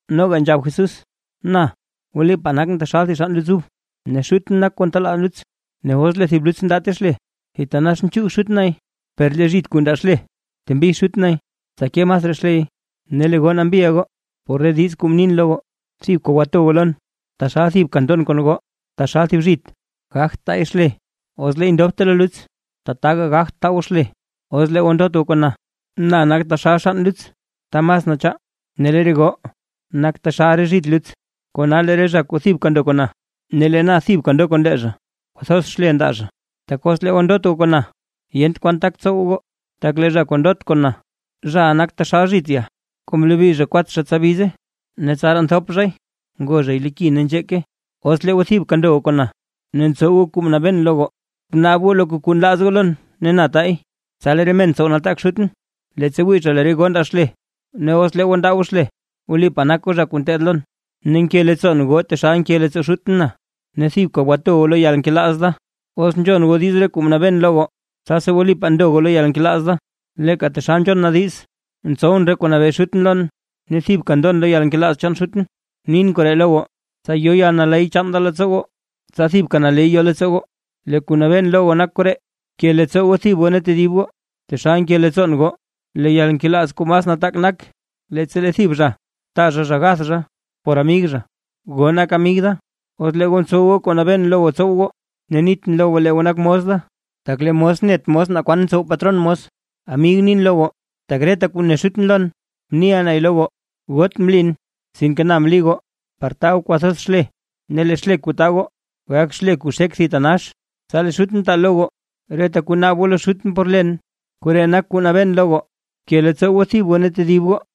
Noga nzhab Jesús: ―Na wlipaa nakʼn taxal thib xann luts ub, ne Xutʼn nak kuu ntenaa luts. Ne os lee thib zhit luts ndaate xle, thitanax nchuug Xut nay. Per lee zhit kuu ndaa xle, ntembi Xut nay tsa ke masraa xley. Ne lee goo nambiʼa goo por re diiz kuu mnin lo goo. Thibka gwato goo lon, taxal thibka ndon kon goo. Taxal thib zhit gagt taay xle os leey ndobte lo luts; tataka gagt taa goo xle, os lee goo ndot goo kon na. ’Na nak taxal xann luts ta mas nachaa, ne lee re goo nak taxal re zhit luts. Kona lee re zha kuu thibka ndo kon na, ne lee na thibka ndo kon lee zha kwathoz xle ndaa zha, tak os lee goo ndot goo kon na, yent kwan tak tsow goo. Tak lee zha kuu ndot kon na, zhaʼa nak taxal thib zhit ya kuu mlobi zha kwatxa tsa bize, ne tsaraa nthop zhay ngo zhay lo ki ne nzheeke. ’Os lee goo thibka ndo goo kon na, ne ntsow goo kuu mnabeen lo goo, bnaab goo loka kuu nlaaz goo lon ne lee na tay. Tsa lee re men tsow nataak Xutʼn leettsa wii zha lee re goo ndaa xle, ne os lee goo ndaa goo xle, wlipaa nak goo zha kuu ngeteed lon. Ne nke leettsoon goo taxal nke leettsoo Xutʼn na, ne thibka gwato goo lo yalnkelaaz da. Os nzhon goo diiz re kuu nabeen lo goo, tsasi wlipaa ndo goo loo yalnkelaaz da, leeka taxal nzhon na diiz ntsowʼn re kuu nabee Xutʼn lon, ne thibka ndon lo yalnkelaaz chaan Xutʼn. ’Mnin koree lo goo, tsa yo yalnaley chaan da leettsoo goo, tsa thibka naley yo leettsoo goo. Lee kuu nabeen lo goo nak koree: Bke leettsoo goo thib goo ne tedib goo, taxal nke leettsoon goo. Lee yalnkelaaz kuu mas nataak nak, leettsa lee thib zha taa zha zha gath zha por amig zha. Goo nak amig da, os lee goo ntsow goo kuu mnabeen lo goo tsow goo. Ne nitʼn lo goo lee goo nak mos da, tak lee mos net mos naa kwan ntsow patron mos. Amig nin lo goo, tak reta kuu ne Xutʼn lon mniʼa nay lo goo. Goot mlin, sinke na mli goo par taa goo kwathoz xle, ne lee xle kuu taa goo, gak xle kuu xek thitanax; tsa lee Xutʼn taa lo goo, reta kuu naab goo lo Xutʼn por len. Koree nak kuu nabeen lo goo: Bke leettsoo goo thib goo ne tedib goo.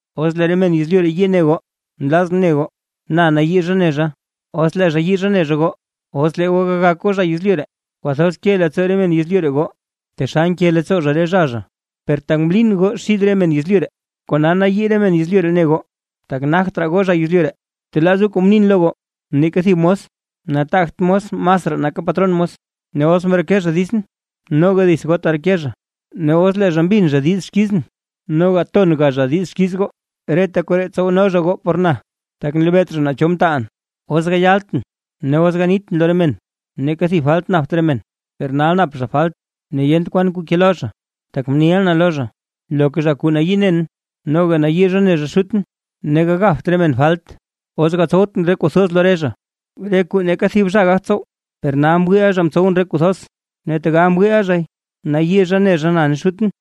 ’Os lee re men yezlyu ree yii ne goo, nlazʼn ne goo, na nayii zha ne zha os lee zha yii zha ne zha goo. Os lee goo gagak goo zha yezlyu ree, kwathoz ke leettsoo re men yezlyu ree goo, taxal nke leettsoo zha re zha zha, per tak mlin goo xid re men yezlyu ree, kona nayii re men yezlyu ree ne goo, tak nagt raa goo zha yezlyu ree. Btelaaz goo kuu mnin lo goo: “Neeka thib mos nataagt mos masraa nake patron mos”. Ne os mreke zha ditsʼn, noga dits goo tereke zha, ne os lee zha mbin zha diiz xkizʼn, noga tonga zha diiz xkiiz goo. Reta koree tsowno zha goo por na, tak nlebeet zha naa cho mtaalʼn. ’Os gayaltʼn ne os ganitʼn lo re men, neeka thib falt napt re men. Per nal nap zha falt ne yent kwan kuu kelo zha, tak mniʼa na lo zha. Loka zha kuu nayii nen, noga nayii zha ne zha Xutʼn. Ne gagapt re men falt, os gatsowtʼn re kuu thoz lo re zha, re kuu neeka thib zha gagt tsow. Per nal mwiiʼa zha mtsowʼn re kuu thoz, ne tegal mwii zhay, nayii zha ne zha na ne Xutʼn.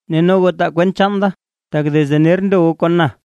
Ne no goo taa kwent chaan da, tak desde ner ndo goo kon na.